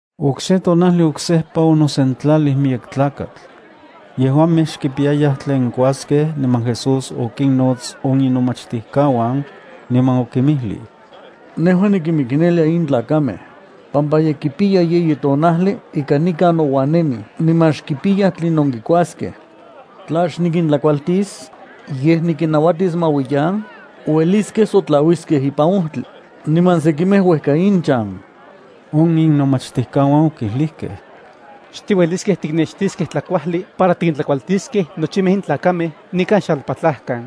Okse tonajli oksejpa onosentlalij miyek tlakatl. Yejuamej xkipiyayaj tlen kuaskej niman Jesús okinnots on inomachtijkauan, niman okinmijlij: —Nejua nikinmiknelia in tlakamej, pampa ye kipiya yeyi tonajli ika nikan nouan nemij niman xkipiyaj tlinon kikuaskej. Tla xnikintlakualtis, yej nikinnauatis ma uiyan, ueliskej sotlauiskej ipan ojtli, niman sekimej uejka inchan. On inomachtijkauan okijlijkej: —Xtiueliskej tiknextiskej tlakuajli para tikintlakualtiskej nochimej in tlakamej nikan xalpatlajkan.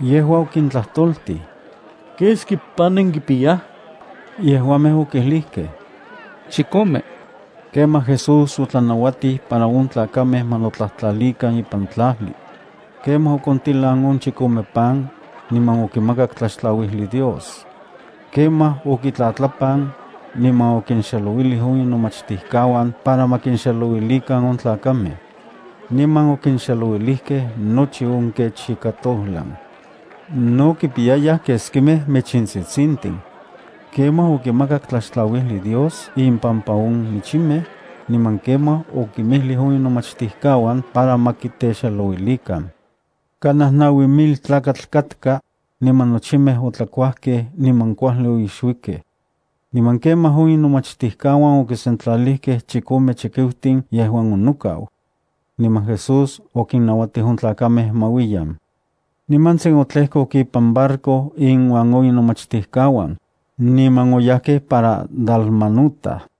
Yejua okintlajtoltij: —¿Keski pan nenkipiyaj? Yejuamej okijlijkej: —Chikome. Kemaj Jesús otlanauatij para on tlakamej ma notlajtlalikan ipan tlajli. Kemaj okontilan on chikome pan, niman okimakak tlaxtlauijli Dios. Kemaj okitlatlapan, niman okinxelouilij on inomachtijkauan para ma kinxelouilikan on tlakamej. Niman okinxelouilijkej nochi on kech ika tojlan. No kimpiyayaj keskimej michintsitsintin. Kemaj okimakak tlaxtlauijli Dios inpampa on michimej, niman kemaj okinmijlij on inomachtijkauan para ma kitexelouilikan. Kanaj naui mil tlakatl katka, niman nochimej otlakuajkej niman kuajli oixuikej. Niman kemaj on inomachtijkauan okisentlalijkej chikome chikiutin yejuan onokau. Niman Jesús okinnauatij on tlakamej ma uiyan. Nimantsin otlejkok ipan barco inuan on inomachtijkauan, niman oyajkej para Dalmanuta.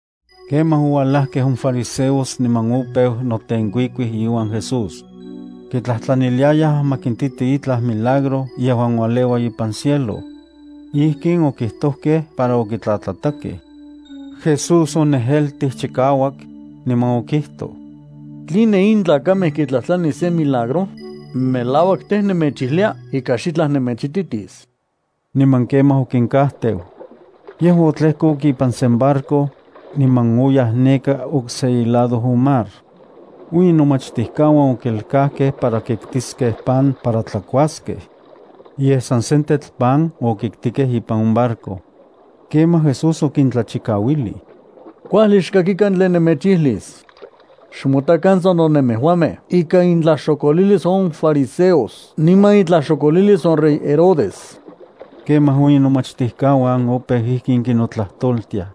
Kemaj oualajkej on fariseos niman opeu notenkuikuij iuan Jesús. Kitlajtlaniliayaj ma kintiti itlaj milagro yejuan ualeua ipan cielo. Ijkin okijtojkej para okitlatlatakej. Jesús onejeltij chikauak, niman okijtoj: —¿Tline in tlakamej kitlajtlanij sen milagro? Melauak tej, nemechijlia ika xitlaj nemechititis. Niman kemaj okinkajteu. Yejua otlejkok ipan sen barco, niman oyaj neka okse ilado on mar. On inomachtijkauan okelkajkej para kiktiskej pan para tlakuaskej. Yej san sentetl pan okitkijkej ipan on barco. Kemaj Jesús okintlachikauilij: —Kuajli xkakikan tlen nemechijlis. Xmotakan sano nemejuamej ika intlaxokolilis on fariseos niman itlaxokolilis on rey Herodes. Kemaj on inomachtijkauan opeu ijkin kinotlajtoltiaj: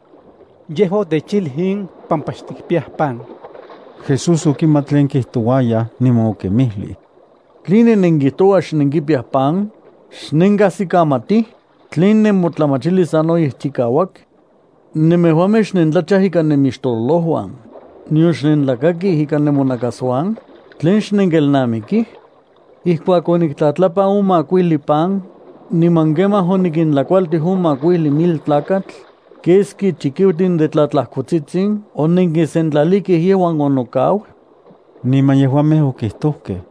—Yejua otechijlij in pampa xtikpiyaj pan. Jesús okimat tlen kijtouayaj, niman okinmijlij: —¿Tline nenkijtouaj xnenkipiyaj pan? ¿Xnenkajsikamatij? ¿Tlen nemotlamachilis sanoyej chikauak? ¿Nemejuamej xnentlachaj ikan nemixtololojuan, nion xnentlakakij ikan nemonakasuan? ¿Tlen xnenkelnamikij? ¿Ijkuak oniktlatlapan on makuijli pan, niman kemaj onikintlakualtij on makuijli mil tlakatl, keski chikiutin de tlatlajkotsitsin onenkisentlalijkej yejuan onokau? Niman yejuamej okijtojkej: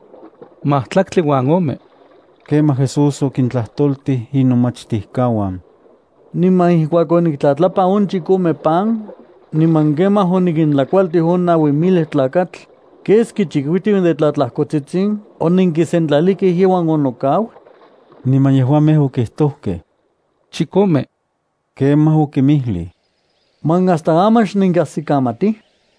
—Majtlaktli uan ome. Kemaj Jesús okintlajtoltij inomachtijkauan: —¿Niman ijkuak oniktlatlapan on chikome pan, niman kemaj onikintlakualtij on naui mil tlakatl, keski chikiutin de tlatlajkotsitsin onenkisentlalijkej yejuan onokau? Niman yejuamej okijtojkej: —Chikome. Kemaj okinmijlij: —¿Man hasta aman xnenkajsikamatij?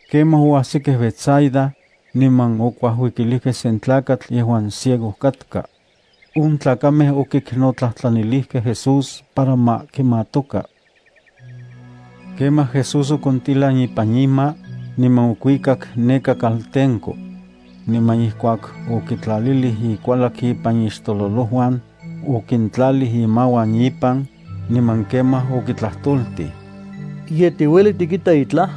Kemaj oajsikej Betsaida, niman okuajuikilijkej sen tlakatl yejuan ciego katka. On tlakamej okiknotlajtlanilijkej Jesús para ma kimatoka. Kemaj Jesús okontilan ipan ima, niman okuikak neka kaltenko. Niman ijkuak okitlalilij ikualak ipan ixtololojuan, okintlalij imauan ipan, niman kemaj okitlajtoltij: —¿Ye tiueli tikita itlaj?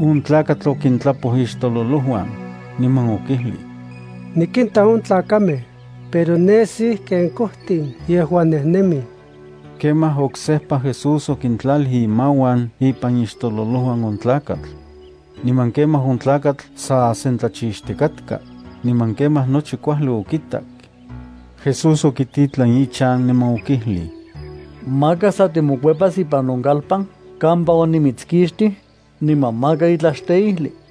On tlakatl okintlapoj ixtolouan, niman okijlij: —Nikinta on tlakamej, pero nesij ken kojtin yeuan nejnemij. Kemaj oksejpa Jesús okintlalij imauan ipan ixtololojuan on tlakatl. Niman kemaj on tlakatl sa sentlachixtikatka, niman kemaj nochi kuajli okitak. Jesús okititlan ichan niman okijlij: —Maka sa timokuepas ipan on kalpan kampa onimitskixtij, niman maka itlaj xteijli.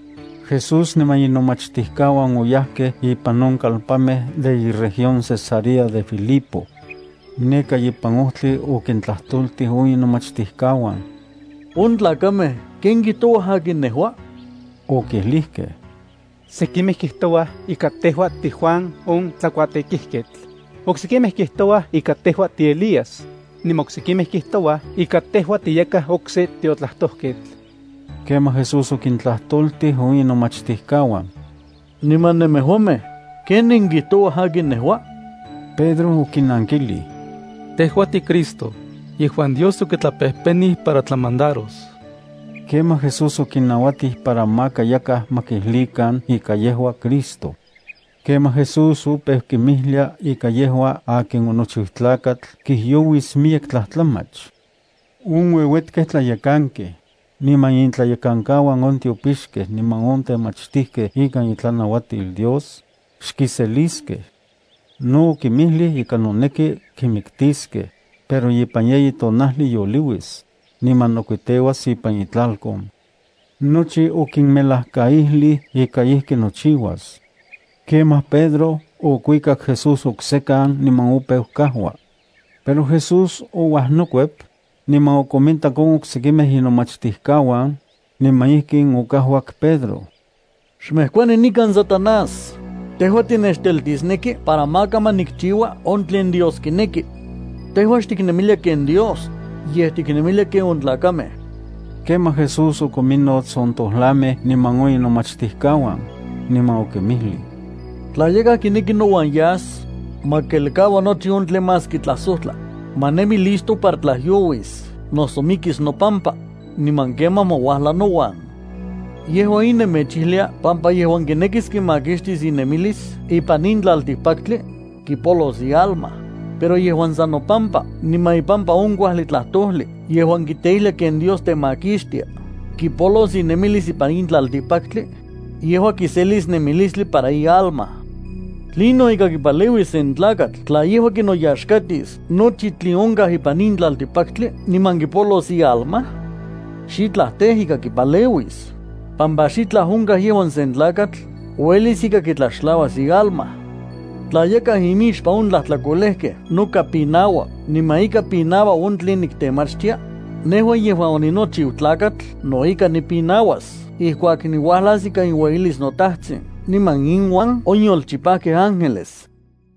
Jesús niman inomachtijkauan oyajkej ipan on kalpanmej de iregión Cesarea de Filipo. Neka ipan ojtli okintlajtoltij on inomachtijkauan: —On tlakamej, ¿ken kijtouaj akin nejua? Okijlijkej: —Sekimej kijtouaj ika tejua tiJuan on tlakuatekijketl, oksekimej kijtouaj ika tejua tiElías, niman oksekimej kijtoua ika tejua tiyakaj okse tiotlajtojketl. Kemaj Jesús okintlajtoltij on inomachtijkauan: —Niman nemejuamej, ¿ken nenkijtouaj akin nejua? Pedro okinankijlij: —Tejua tiCristo, yejuan Dios okitlapejpenij para tlamandaros. Kemaj Jesús okinnauatij para maka yakaj ma kijlijkan ika yejua Cristo. Kemaj Jesús opeu kinmijlia ika yejua akin onochiu Tlakatl kijyouis miyek tlajtlamach. On ueuetkej tlayekankej, niman intlayekankauan on tiopixkej niman on temachtijkej ikan itlanauatil Dios, xkiseliskej. No okinmijlij ika noneki kimiktiskej, pero ipan yeyi tonajli yoliuis, niman nokuiteuas ipan itlalkon. Nochi okinmelajkaijlij ika ijki nochiuas. Kemaj Pedro okuikak Jesús oksekan niman opeu kajua. Pero Jesús ouajnokuep, niman okomintak on oksekimej inomachtijkauan, niman ijkin okajuak Pedro: —¡Xmejkuani nikan Satanás! Tejua tinechteltisneki para maka ma nikchiua on tlen Dios kineki. Tejua xtiknemilia ken Dios, yej tiknemilia ken on tlakamej. Kemaj Jesús okominnots on tojlamej niman on inomachtijkauan, niman okinmijlij: —Tla yakaj kineki nouan yas, ma kelkaua nochi on tlen más kintlasojtla, ma nemi listo para tlajyouis noso mikis nopampa, niman kemaj ma uajla nouan. Yejua in nemechijlia pampa yejuan kinekis kimakixtis inemilis ipan in tlaltikpaktli, kipolos ialma, pero yejuan san nopampa niman ipampa on kuajli tlajtojli yejuan kiteijlia ken Dios temakixtia kipolos inemilis ipan in tlaltikpaktli, yejua kiselis nemilistli para ialma. ¿Tlinon ika kipaleuis sen tlakatl tla yejua kinoyaxkatis nochi tlen onkaj ipan in tlaltikpaktli niman kipolos ialma? Xitlaj tej ika kipaleuis, pampa xitlaj onkaj yejuan sen tlakatl uelis ika kitlaxtlauas ialma. Tla yakaj imixpan on tlajtlakolejkej noka pinaua niman ika pinaua on tlen niktemachtia, nejua yejuan oninochiu Tlakatl no ika nipinauas ijkuak niuajlas ikan iueyilis noTatajtsin niman inuan on yolchipajkej ángeles.